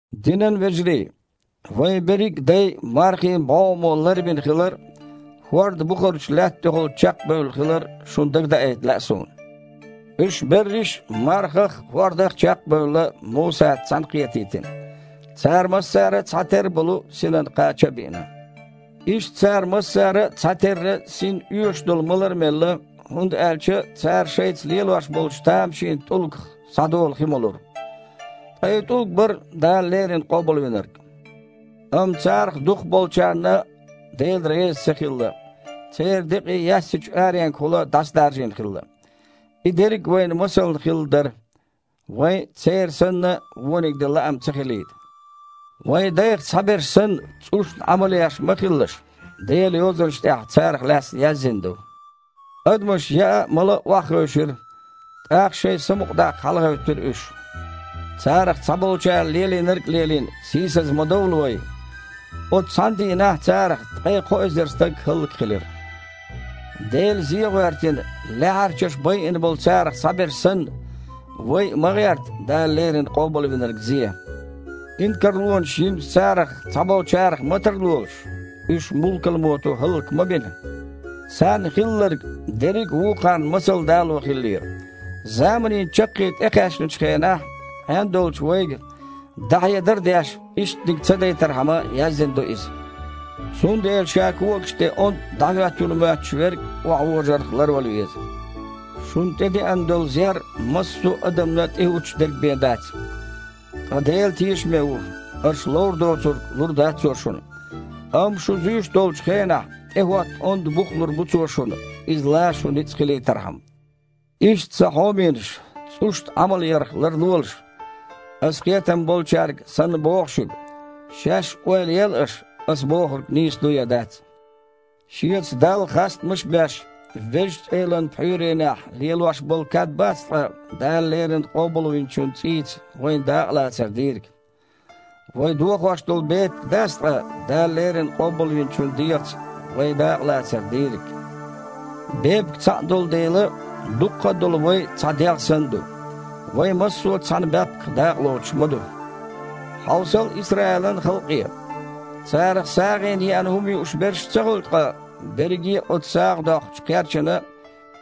Динан вежарий! Вайн берриг а дай мархийн бІогІамо ларбина хилар а, хІорда бухарчу лаьтта тІехула чекхбевлла хилар а шуна дагадаийта лаьа суна. Уьш берриш а, мархах а, хІордах а чекх а бевлла, Мусаца цхьаьнакхетийтина. Цара массара а цхьатерра болу синан кхача а биъна. Иштта цара массара а цхьатерра синна оьшуш долу малар а мелла, хІунда аьлча цара шайца лелош болчу тамашийнчу тІулгах схьадолу хи молура. Ткъа и ТІулг бара – Дала леррина Къобалвинарг. Амма царах дукхахболчарна Дела реза ца хилла, церан декъий яьссачу аренгахула дІасадаржийна хилла. И дерриг вайна масална хилла дара, вайн а, церан санна, вониг дан лаам ца хилийта. Вайн дайх цхьаберш санна, цІушна Іамал еш ма хилалаш. Делан Йозанаш тІехь царах лаьцна яздина ду: «Адамаш яа а, мала а охьахевшира, тІаккха шайн самукъадаккха хьалагІевттира уьш». Царах цхьаболчара лелийнарг а лелийна, сийсаза ма довла вай! Оцу цхьана дийнахь царах ткъе кхо эзар стаг хІаллакьхилира. Дела зе а гІоьртина, лаьхьарчаша байина болу царах цхьаберш санна, вай а ма гІерта Дала леррина Къобалвинарг зе. Инкарлонаш йинчу царах цхьаболчарах ма тарлолаш – уьш мулкалмото хІаллак ма бина. Царна хилларг дерриг а вукхарна масал дало хиллера. Заманийн чаккхе тІекхаьчначу хенахь Іен долчу вайга, дІахьедар а деш, иштаниг ца дайтархьама яздина ду иза. Цундела ша когаш тІе ондда дІахІоьттина ву моьттуш верг охьавожарх ларвала веза. Шуна тІедеана долу зер массо а адамна тІехІуттуш дерг бен дац. Ткъа Дела тешаме ву, аша ловр доцург лур дац Цо шуна. Амма шу зуьйш долчу хенахь, тІехІотта онда бух лур бу Цо шуна, иза лан шун ницкъ хилийтархьама. Иштта, сан хьоменаш, цІушна Іамалъярх ларлолаш! Аса кхетам болчаьрга санна боху шуьга. Шаьш а ойла ел аша, аса бохург нийса ду я дац. Шеца Далла хастамаш а беш, Везачу Элан пхьуьйренехь лелош болу кад бац ткъа Дала леррина Къобалвинчун цІийца вайн дакъалацар дийриг? Вай дохош долу бепиг а дац ткъа Дала леррина Къобалвинчун дегІаца вайн дакъалацар дийриг? Бепиг цхьаъ долу дела, дуккха а долу вай а цхьа дегІ санна ду. Вай массо а цхьана баьпках дакъалоцуш ма ду. Хьовсал Исраилан халкъе – царах сагІина еана хІума юуш берш а ца хуьлу ткъа берриге а цу сагІа доккхучу кхерчана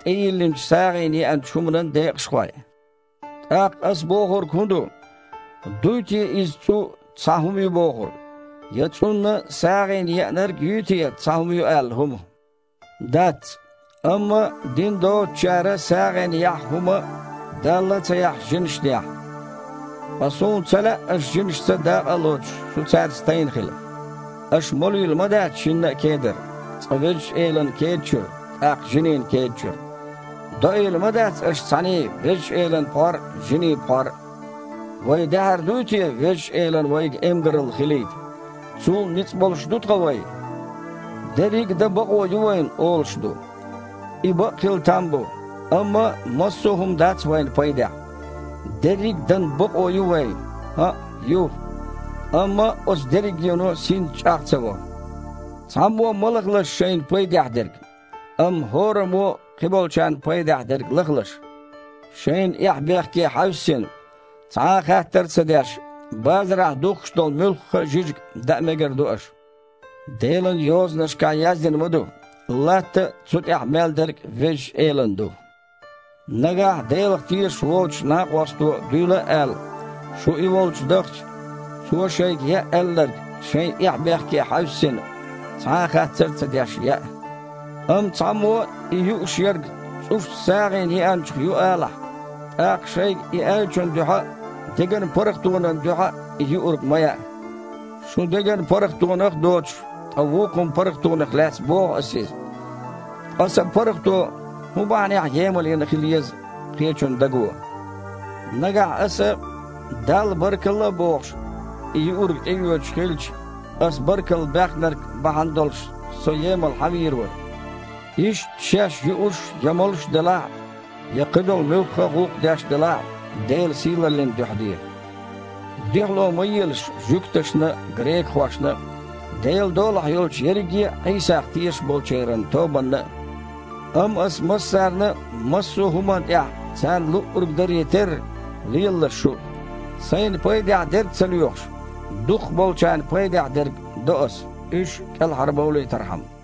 тІейиллинчу сагІина еанчу хІуманан декъашхой? ТІаккха аса бохург хІун ду? Дуй те иза цІу цхьа хІума ю бохург? Я цІунна сагІина еанарг а юй те цхьа хІума ю аьлла хІума? Дац! Амма дин доцучара сагІина яхьа хІума, Далла а ца яхьаш, жинашна яхьа. Ткъа суна ца лаьа, аша жинашца дакъа а лоцуш, шу цаьрца тайна хила. Аша молийла ма дац шинна а кедара: цкъа Везачу Элан кеда чуьра, тІаккха жинийн кеда чуьра. Доийла ма дац аша цхьаьний Везачу Элан пхьор а, жинийн пхьор а. Вай даьхьар дуй те Везачу Элан вайга эмгаралла хилийта? Цул а ницкъ болуш ду ткъа вай? «Дерриг а дан бакъо ю вайн» – олуш ду. Иза бакъ хила там бу, амма массо а хІума дац вайна пайдехь. «Дерриг а дан бакъо ю вайн». ХІаъ, ю, амма оцу дерригено а синца чІагІ ца во. Цхьаммо а ма лахалаш шайна пайдехь дерг, амма хІораммо а кхиболчарна пайдехь дерг лахалаш. Шайн эхь-бехке хьаьвссина, цхьа а хаттар ца деш, базарахь духкуш долу муьлхха а жижиг даа мегар ду аша. Делан Йозанашкахь яздина ма ду: «Латта а, цу тІехь мел дерг а Везачу Элан ду». Нагахь Делах тешаш воцучу накъосто дуьйла а аьлла, шу и волчу дахча, цо шайга яа аьлларг, шайн эхь-бехке хьаьвссина, цхьа а хаттар ца деш яа. Амма цхьаммо и юуш ерг цІушна сагІина еанчух ю алахь, тІаккха шайга и аьллачун дуьхьа а, деган паргІатонан дуьхьа а и юург ма яа. Шун деган паргІатонах а доцуш, ткъа вукхун паргІатонах лаьцна боху аса иза. Ткъа сан паргІато хІун бахьанехь емалйина хила еза кхечун даго? Нагахь аса, Далла баркалла а бохуш, и юург тІеоьцуш хилча, аса баркалла баьхнарг бахьана долуш со емал хьан вийр вара? Иштта шаьш юуш я молуш делахь а, я кхидолу муьлхха а гІуллакх деш делахь а, Делан сийлаллин дуьхьа де. Дуьхьало ма елаш жуьгташна а, грекахошна а, Делан долахь йолчу ерриге а Іийсах тешаш болчеран тобанна а, амма, аса массарна а, массо а хІуманна тІехь царна луъург даре терра, лелалаш шу а. Сайна пайдехь дерг а ца лоьхуш, дукхахболчарна пайдехь дерг до аса, уьш а кІелхьарбовлийтархьама.